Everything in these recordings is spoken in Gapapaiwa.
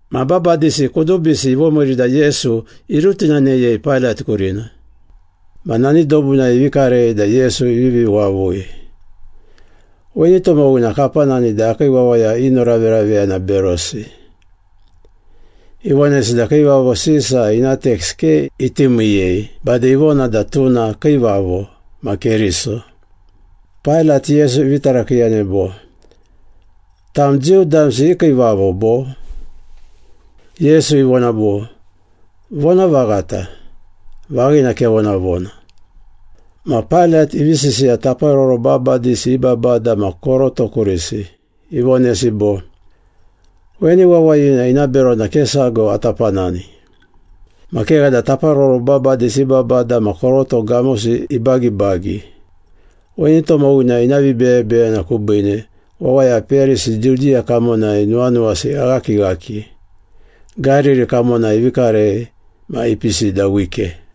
Ma babadisi kudubisi ivomiiri da Yesu irutinaneyei Pailat kurina. Ma nani dobunai ivi karei da Yesu ivivi wavui, “Weni tomowina kapanani da akii wawaya inoraveraveyana berosi. Ivonesi da Kiivavo Sisa ina teks ke iti miiyei, bade ivona da tuna kiivavo, ma Keriso.” Pailat Yesu ivi tarakiiyanei bo, “Tam Jiu damsi i kiivavo, bo?” Yesu ivona bo, “Vonavaghata, vaghina kevonavona.” Ma Pailat ivi sisiya taparoro babadisi i babada ma koroto kurisi. Ivonesi bo, “Weni wawayina ina berona ke sago ata panani.” Ma kegha da taparoro babadisi i babada ma koroto gamosi ibagibagi, “Weni tomowina ina vibeyebeyena kubiine, wawaya peyarisi Judiya kamonai nuwanuwasi eghakighaki. Gariri kamonai ivi karei ma ipisi da wike.”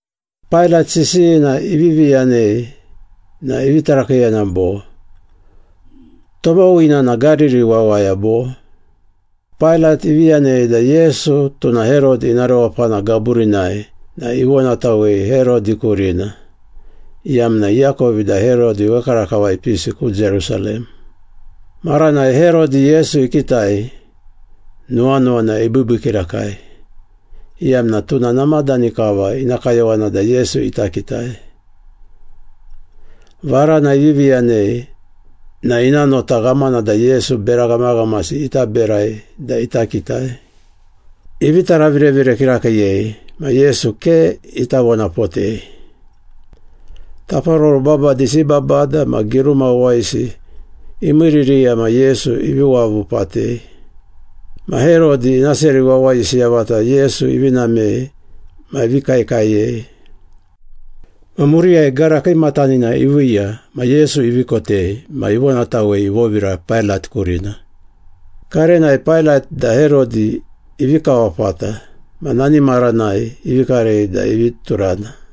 Pailat sisiyina ivivi yanei na ivi tarakiiyana bo, “Tomowina na Gariri wawaya bo?” Pailat ivi yanei da Yesu tuna Herodi ina rewapana gaburinai na ivonatawei Herodi kurina, iyamna iakovi da Herodi wekarakava ipisi ku Jerusalem. Maranai Herodi Yesu ikitai, nuwanuwana ibiibii kirakai, iyamna tuna namadani kava ina kayowana da Yesu ita kitai. Varana ivivi yanei na ina nota ghamana da Yesu bera ghamaghamasi ita berai da ita kitai. Ivi taravirevire kirakiiyei ma Yesu ke ita vonapotei. Taparoro babadisi i babada ma giruma wawayisi imiiririya ma Yesu ivi wavu patei. Ma Herodi, ina seri wawayisi yavata Yesu ivi namei ma ivi kaekaeyei. Ma muriyai gara kiimatanina iviiya ma Yesu ivi kotei ma ivonatawei ivovira Pailat kurina. Karenai Pailat da Herodi ivi kawapata ma nani maranai ivi karei da ivi turana.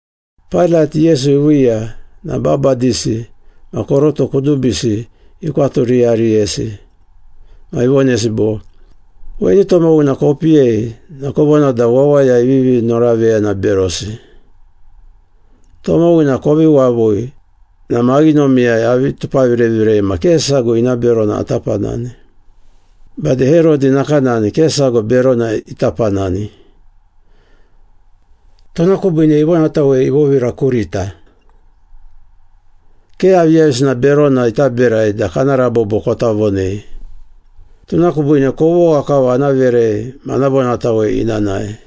Pailat, Yesu iviiya na babadisi ma koroto kudubisi ikwaturiyariyesi, ma ivonesi bo, “Weni tomowina kopiyei na kovona da wawaya ivivi noraveyana berosi. Tomowina kovi wavui na maghinomiyai avi tupavirevirei ma ke sago ina berona ata panani. Bade Herodi nakanani ke sago berona ita panani. Tuna kubiine ivonatawei ivovira kurita. Ke aviyavisina berona ita berai da kana rabobo kota vonei. Tuna kubiine kovogha kava ana verei ma ana vonatawei ina nae.”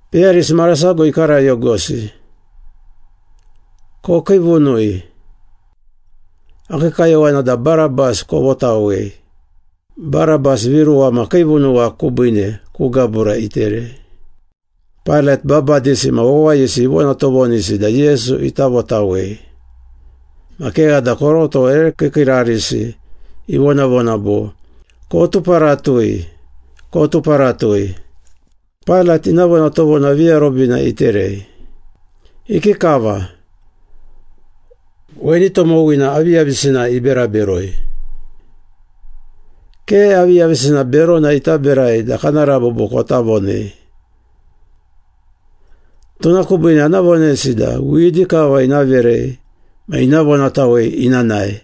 Peyarisi marasago ikarayogosi, “Kokiivunui! Akii kayowana da Barabas kovotawei!” (Barabas viruwa ma kiivunuwa kubiine ku gabura iterei.) Pailat babadisi ma wawayisi ivonatovonisi da Yesu ita votawei. Ma kegha da koroto ere kiikiirarisi ivonavona bo, “Kotuparatui! Kotuparatui!” Pailat ina vonatovona viarobina iterei, “Ikikava? Weni tomowina aviyavisina ibera beroi? Ke aviyavisina berona ita berai da kana rabobo kota vonei. Tuna kubiine ana vonesi da widi kava ina verei ma ina vonatawei ina nae.”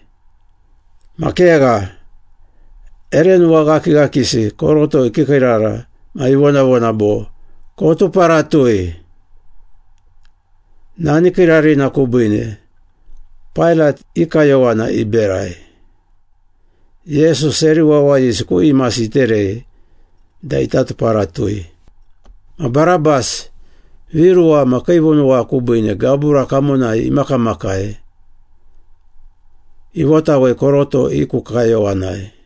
Ma kegha, ere nuwaghakighakisi koroto ikiikiirara ma ivonavona bo, “Kotuparatui!” Nani kiirarina kubiine, Pailat i kayowana iberai. Yesu seri wawayisi ku imasi iterei da ita tuparatui. Ma Barabas, viruwa ma kiivunuwa kubiine gabura kamonai imakamakai, ivotawei koroto i ku kayowanai.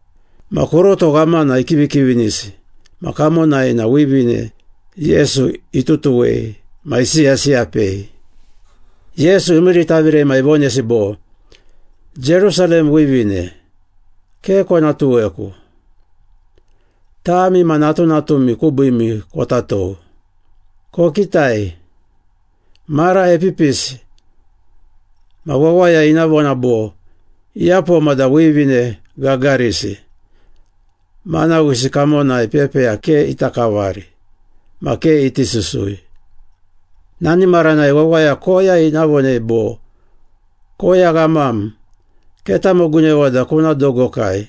Ma koroto ghamana ikivikivinisi ma kamonai na wivine Yesu itutuwei ma isiyasiyapei. Yesu imiiritavire ma ivonesi bo, “Jerusalem wivine, ke kona tuweku. Tami ma natunatumi kubiimi kota tou. Kokitai, mara epipisi ma wawaya ina vona bo, ‘Iyapoma da wivine gagarisi, manawisi kamonai pepeya ke ita kavari, ma ke iti susui.’ Nani maranai wawaya koya ina vonei bo, ‘Koya ghamam, ketamogunewa da kuna dogokai!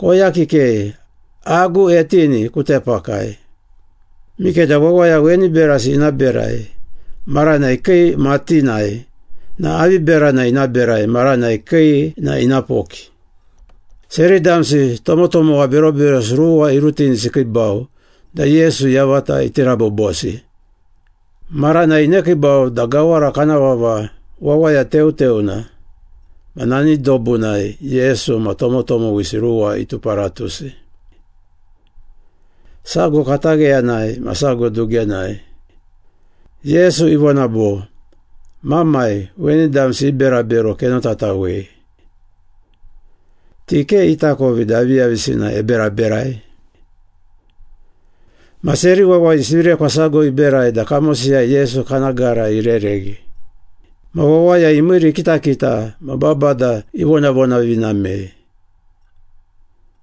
Koya kikei, agu etini ku tepakai!’ Mikeda wawaya weni berasi ina berai maranai kii matinai, ma avi berana ina berai maranai kii na ina poki?” Seri damsi tomotomowa beroberosi ruwa irutinisi ikiibau da Yesu yavata iti rabobosi. Maranai inekiibau da gawara kana vava ‘Wawaya Teuteuna,’ ma nani dobunai Yesu ma tomotomowisi ruwa ituparatusi. Sago katagheyanai ma sago dugenai. Yesu ivona bo, “Mamai, weni damsi i berabero kenotatawei. Ti ke itakovi da aviyavisina eberaberai.” Ma seri wawayisi virekwa sago iberai da kamosiyai Yesu kana gara irereghi. Ma wawaya imiiri ikitakita ma babada ivonavonavinamei.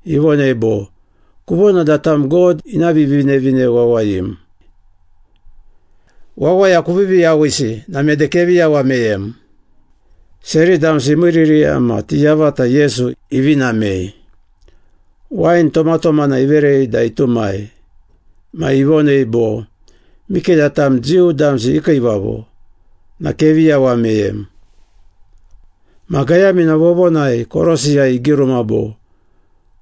Ivonei bo, “Kuvona da tam God ina Vivinevine Wawayim. Wawaya kuvivi yawisi na mede kevi yawa meyem!” Seri damsi imiiririya ma ti yavata Yesu ivi namei. Wain tomatomana iverei da itumai ma ivonei bo, “Mikeda tam Jiu damsi i kiivavo na kevi yawa meyem.” Ma gayamina vovonai, korosiyai, igiruma bo,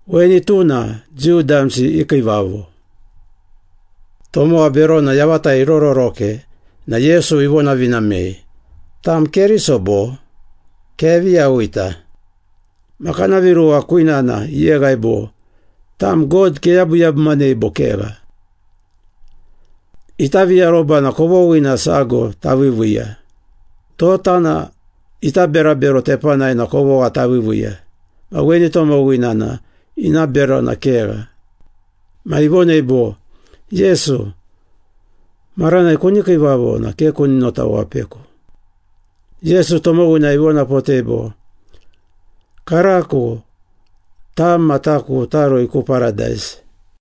‘Weni tuna Jiu damsi i kiivavo.’ Tomowa berona yavata irororoke na Yesu ivonavinamei, “Tam Keriso bo? Kevi yawita.” Ma kana viruwa kwinana iyeghai bo, “Tam God keyabuyabumanei bo kegha? Ita viaroba na kovoghina sago taviiviiya. Tota na ita berabero tepanai na kovogha taviiviiya ma weni tomowina na ina berona kegha.” Ma ivonei bo, “Yesu, maranai kuni kiivavo na ke kuni notawapeku.” Yesu tomowina ivonapotei bo, “Karako tam ma taku tarui ku Paradais.”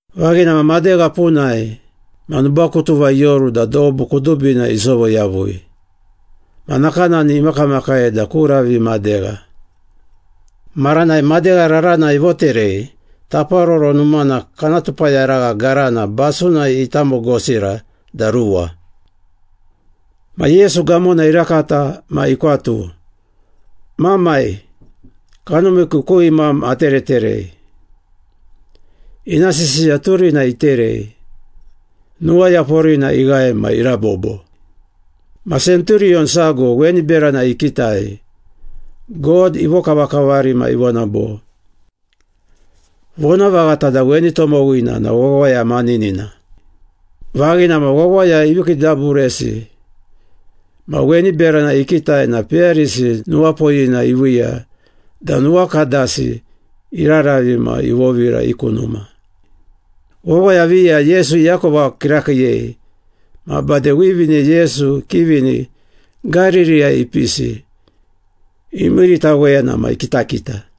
Vaghina ma madegha punai ma nubakutuva ioru da dobu kudubina isovo yavui, ma nakanani imakamakai da ku ravi madegha. Maranai madegha rarana ivoterei Taparoro Numana kana tupayaragha garana basunai itamogosira da ruwa. Ma Yesu gamona irakata ma ikwatu, “Mamai, kanumiku ku imam atereterei.” Ina sisiya turina iterei, nuwayaporina ighae ma irabobo. Ma senturiyon sago weni berana ikitai, God ivokavakavari ma ivona bo, “Vonavaghata da weni tomowina na wawaya maninina.” Vaghina ma, wawaya ivi kiidaburesi ma weni berana ikitai na peyarisi nuwapoyina iviiya da nuwakadasi iraravi ma ivovira i ku numa. Wawaya viya Yesu iakova kirakiiyei ma bade wivine Yesu ikivini Gaririyai ipisi, imiiritaweyana ma ikitakita.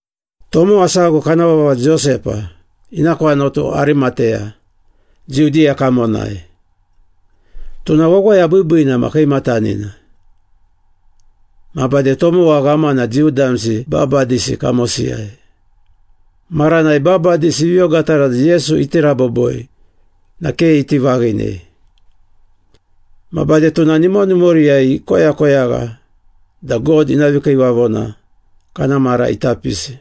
Tomowa sago kana vava Josepa, ina kwanatu Arimateya, Judiya kamonai. Tuna wawaya biibiina ma kiimatanina. Ma bade tomowa ghamana Jiu damsi babadisi kamosiyai. Maranai babadisi ivi ogatara da Yesu iti raboboi na ke iti vaghinei. Ma bade tuna nimonimoriyai ikoyakoyagha da God ina vikiivavona kana mara ita pisi.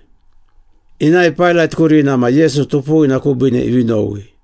Inae Pailat kurina ma Yesu tupuwina kubiine ivi nowi.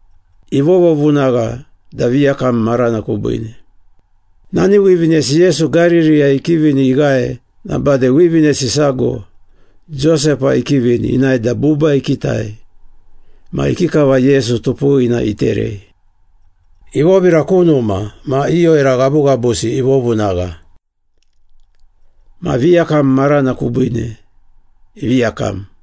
Ivovovunagha da viyakam marana kubiine. Nani wivinesi Yesu Gaririyai ikivini ighae na bade wivinesi sago Josepa ikivini inae da buba ikitai ma ikikava Yesu tupuwina iterei. Ivovira ku numa ma i oira ghabughabusi ivovunagha. Ma viyakam marana kubiine ivi yakam.